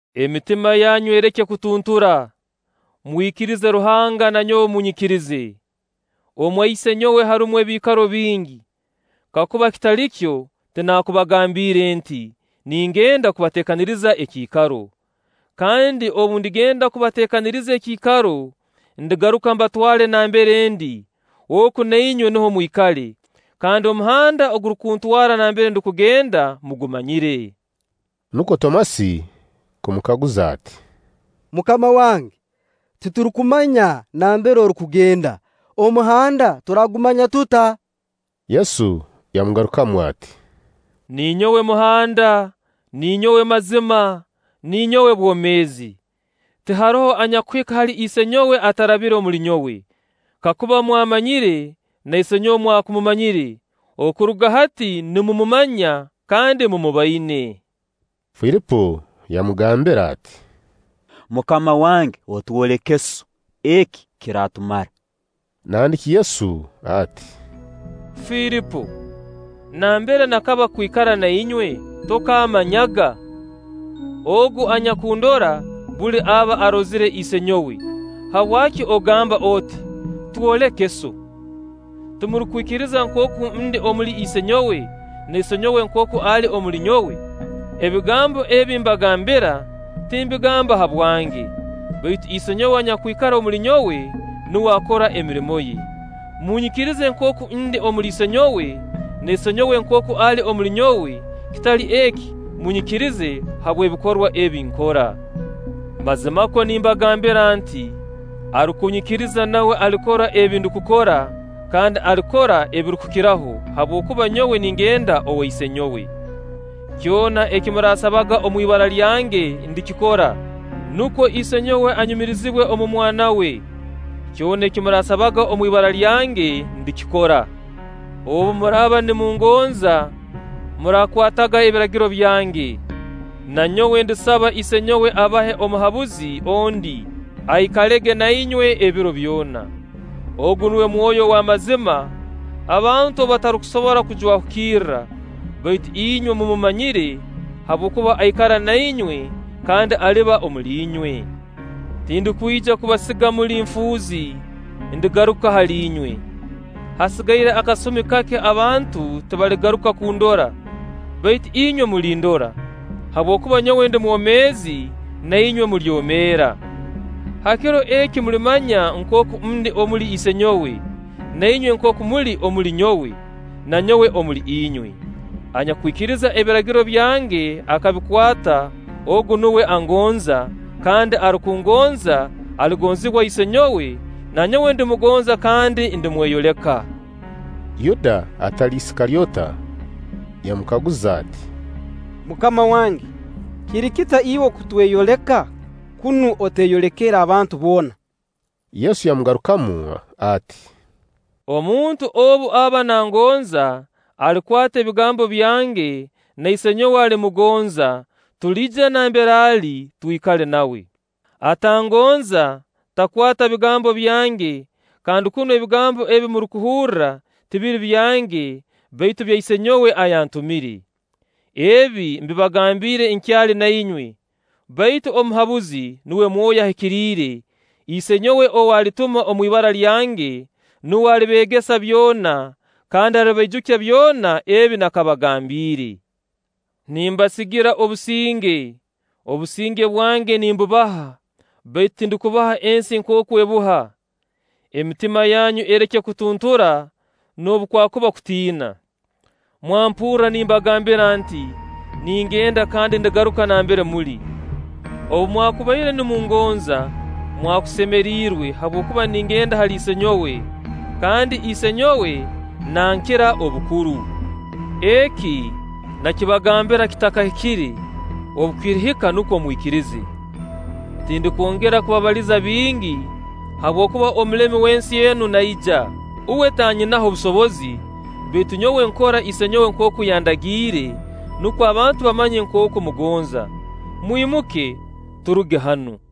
“Emitima yanyu ereke kutuntura. Mwikirize Ruhanga, na nyowe munyikirize. Omwa isenyowe harumu ebiikaro bingi; kakuba kitali kyo, tinakubagambiire nti: Ningenda kubateekaniriza ekiikaro. Kandi obu ndigenda nkabateekaniriza ekiikaro, ndigaruka mbatwale nambere ndi, oku na inywe nuho mwikale. Kandi omuhanda ogurukutwara nambere ndukugenda, mugumanyire.” Nukwo Tomasi kumukaguza ati; “MUKAMA wange, titurukumanya nambere orukugenda; omuhanda turaagumanya tuta?” Yesu yamugarukamu ati: “Ninyowe muhanda, ninyowe mazima, ninyowe bwomeezi. Tiharoho anyakuhika hali Isenyowe atarabire omuli nyowe. Kakuba mwammanyire, na Isenyowe mwakumumanyire; okuruga hati nimumumanya kandi mumuboine.” Filipo yamugambira ati: “MUKAMA wange otwoleke Sso, eki kiraatumara.” Nandiki Yesu ati: “Filipo, nambere nakaba kwikara na inywe tokammanyaga? Ogu anyakundora, buli aba arozire Isenyowe. Habwaki ogamba oti: ‘Twoleke Sso?’ Timurukwikiriza nkooku ndi omuli Isenyowe, na Isenyowe nkooku ali omuli nyowe? Ebigambo ebi mbagambira, timbigamba habwange; baitu Isenyowe anyakwikara omuli nyowe, nuwe akora emirimo ye. Munyikirize nkooku ndi omuli Isenyowe, na Isenyowe nkooku ali omuli nyowe; kitali eki, munyikirize habw'ebikorwa ebi nkora. “Mazimakwo nimbagambira nti: Arukunyikiriza, nawe alikora ebi ndukukora, kandi alikora ebirukukiraho; habwokuba nyowe ningenda owa Isenyowe. Kyona eki muraasabaga omu ibara lyange, ndikikora, nukwo Isenyowe anyumirizibwe omu Mwana we. Kyona eki murakasabaga omu ibara lyange ndikikora.” “Obu muraaba nimungonza, muraakwataga ebiragiro byange. Na nyowe ndisaba Isenyowe abahe Omuhabuzi ondi, aikalege na inywe ebiro byona. Ogu nuwe Mwoyo ow'amazima, abantu ou batarukusobora kujwahukirra, baitu inywe mumumanyire, habwokuba aikara na inywe kandi aliba omuli inywe. “Tindukwija kubasiga muli nfuuzi; ndigaruka hali inywe. Hasigaire akasumi kake abantu tibaligaruka kundora, baitu inywe mulindora; habwokuba nyowe ndi mwomeezi, na inywe mulyomeera. Ha kiro eki mulimanya nkooku ndi omuli Isenyowe, na inywe nkooku muli omuli nyowe, na nyowe omuli inywe. Anyakwikiriza ebiragiro byange akabikwata, ogu nuwe angonza; kandi arukungonza, aligonzibwa Isenyowe, na nyowe ndimugonza kandi ndimweyoleka.” Yuda (atali Isikalyota) yamukaguza ati: “MUKAMA wange, kiri kita iwe okutweyoleka, kunu oteeyolekere abantu boona?” Yesu yamugarukamu ati: “Omuntu obu aba nangonza, alikwata ebigambo byange, na Isenyowe alimugonza; tuliija nambere ali, twikale nawe. Atangonza takwata bigambo byange; kandi kunu ebigambo ebi murukuhuura tibiri byange, baitu bya Isenyowe ayantumire. “Ebi mbibagambiire nkyali na inywe. Baitu Omuhabuzi, nuwe Mwoyo Ahikiriire, Isenyowe ou alituma omu ibara lyange, nuwe alibeegesa byona, kandi alibaijukya byona ebi nakabagambiire. Nimbasigira obusinge, obusinge bwange nimbubaha; baitu tindukubuha ensi nkooku ebuha. Emitima yaanyu ereke kutuntura, noobu kwakuba kutiina. Mwampurra nimbagambira nti: ‘Ningenda, kandi ndigaruka nambere muli.’ Obu mwakubaire nimungonza, mwakusemeriirwe, habwokuba ningenda hali Isenyowe; kandi Isenyowe nankira obukuru. Eki, nakibagambira kitakahikire; obu kirihika nukwo mwikirize. Tindukwongera kubabaliza bingi, habwokuba omulemi w'ensi enu naija. Uwe tannyinaho busobozi; baitu nyowe nkora Isenyowe nkooku yandagiire, nukwo abantu bamanye nkooku mmugonza. Mwimuke, turuge hanu.”